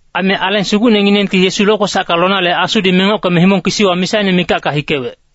Aime Aleng Sugucnenginengti Yesu lokwesacka lonale Asudi mengockeme himong kisiwa misaine mikacka hikewec.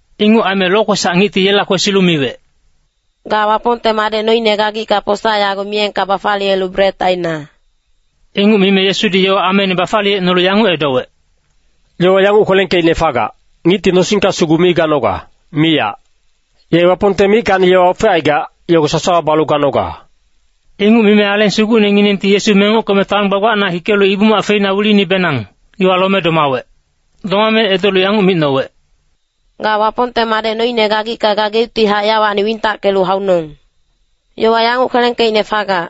Inguc aime Lokwesac Ngicti yela kwesilu miwec, “Ga Wapongte Madec noine gagicka posa yago miyengka bafaliyelu bret aina!” Inguc mime Yesudi yowa ameine bafaliyecnolu yanguc edowec, “Yowa yanguc kwelengkeicne fagac, ‘Ngicti nosingka sugu mi ganoga, miyac. Ye Wapongte mickacni yowa ofecaigac, yogo sasawa balu ganoga.’” Inguc mime Aleng Sugucnenginengti Yesu mengockeme taon gbagbacna hikelu Ibu-mac feina wilinibenang, iwa lome domawec. Domame edolu yanguc micnowec, “Ga Wapongte Madec noine gagicka gageuctihac yawacni wintackelu haunong. Yowa yanguc kwelengkeicne fagac,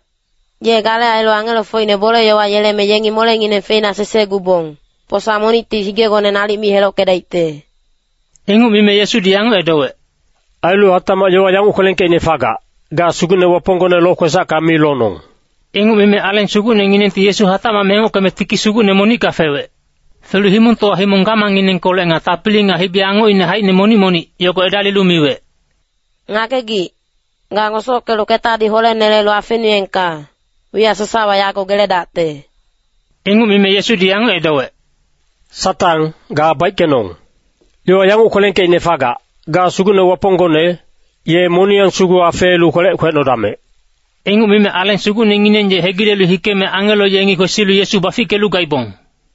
‘Ye gale ailu angelofocine bole-yowa yeleme yengi molengineng feina sesegubong, posa monicti higegone nalic mi helockedaicte.’” Inguc mime Yesudi yanguc edowec, “Ailu hatacmac yowa yanguc kwelengkeicne fagac, ‘Ga Sugucne Waponggone lokwesacka mi lonong.’” Inguc mime Aleng Sugucnenginengti Yesu hatacmac mengockeme tiki sugucne monicka fewec. Felu himongtowa himong gamangnginengkolec nga tapili nga hibi-angocine haicine monic-monic, yogo edalilu miwec, “Ngagegic, ga ngosockelu ketadi holenelelu afenuengka, wiyac sasawa yago geledacte.” Inguc mime Yesudi yanguc edowec, “Satang, ga baickenong. Yowa yanguc kwelengkeicne fagac, ‘Ga Sugucne Waponggone, ye moniyang sugu afeelu kwelec kwecnodamec.’” Inguc mime Aleng Sugucnengineng ye hegilelu hikeme angelo yengi kwesilu Yesu bafickelu gaibong.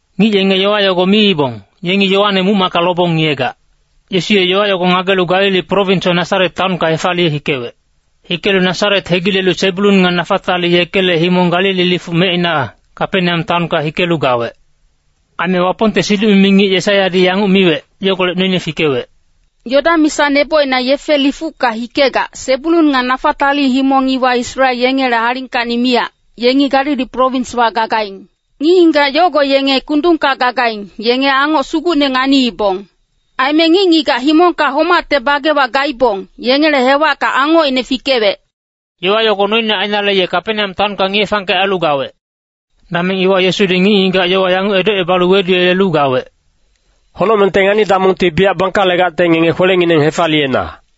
Ngic yenge yowa yogo miibong, “Yengi Yoane muc-macka lobong ngiyegac.” Yesu ye yogo ngagelu Galili prowinswa Nasaret taonka hefaliye hikewec. Hikelu Nasaret hegilelu Sebulun nga Nafatali yekele himong Galili lifuc mecina, Kapeneam taonka hikelu gawec. Aime Wapongte siduc-mimi ngic Yesaiyadi yanguc miwec, yogolec noine fikewec, “Yodan misa nebocina yefe lifucka hikegac, Sebulun nga Nafatali himong iwa Israel yengele alingkacni miyac, yengi Galili prowinswa gagaing. Ngic-ngigac yogo yenge kundungka gagaing, yenge angoc sugucne nganiibong. Aime ngic-ngigac himongka homacte bagewa gaibong, yengele hewacka angocine fikewec.” Yowa yogo noine ainale ye Kapeneam taonka ngiye-fangkec ailu gawec. Dameng iwa Yesudi ngic-ngigac yowa yanguc edocebalu weduyelelu gawec, “Honocmengte ngani-damongti biyac bangkalegacte ngenge kwelengineng hefaliyena.”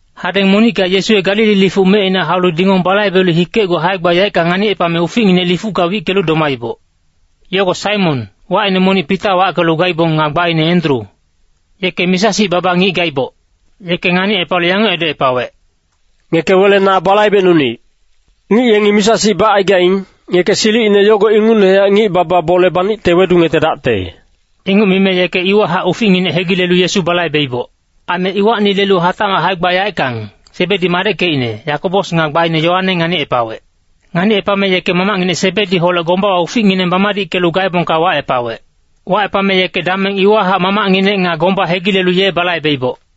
Hadeng monicka Yesu ye Galili lifuc mecina haulu dingong balaibelu hikecgu hae-gba yaeckang nganicepame uficnginec lifucka wickelu domaiboc. Yogo Saimon, wacine monic Pita wackelu gaibong nga gbaine Endru. Yeke misa-sic baba ngic gaiboc. Yeke nganicepalu yanguc edocepawec, “Ngeke wele na balaibecnunic. Ngic yengi misa-sic bacaigaing, ngeke silicine yogo ingucnehac ngic-baba bole banicte wedungetedacte.” Inguc mime yeke iwahac uficnginec hegilelu Yesu balaibeiboc. Aime iwacni lelu hatacmac hae-gba yaeckang, Sebedi madeckecine, Yakobos nga gbaine Yoane nganicepawec. Nganicepame yeke mamacnginec Sebediholec gombawa uficngineng bamadickelu gaebongka wacepawec. Wacepame yeke dameng iwahac mamacnginec nga gomba hegilelu ye balaibeiboc.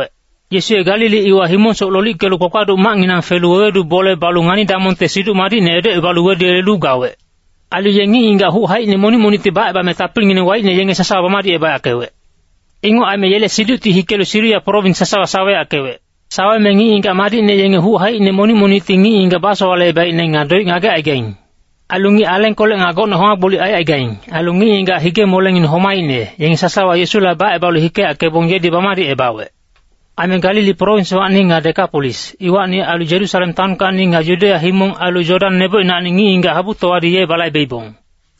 Yesu ye Galili iwa himongsoc lolickelu kpakpaduc macnginang felu wewedu bole balu ngani-damongte Siduc Madicne edocebalu weduyelelu gawec. Ailu ye ngic-ngigac huc haicine monic monicti bacebame tapilingineng waicne yenge sasawa bamadicebayackewec. Inguc aime yele siducti hikelu Siria prowins sasawa saweyackewec. Saweme ngic-ngigac madicne yenge huc haicine monic monicti ngic-ngigac basowalecebaicne nga doic ngagecaigaing. Ailu ngic alengkolec nga gocne homa-gbolic aicaigaing, ailu ngic-ngigac hige-molengineng homaicne, yenge sasawa Yesula bacebalu hikeyackebong yedi bamadicebawec. Aime Galili prowinswacni nga Dekapolis, iwacni ailu Yerusalem taonkacni nga Yudeya himong ailu Yodan nebocinacni ngic-ngigac habutowadi ye balaibeibong.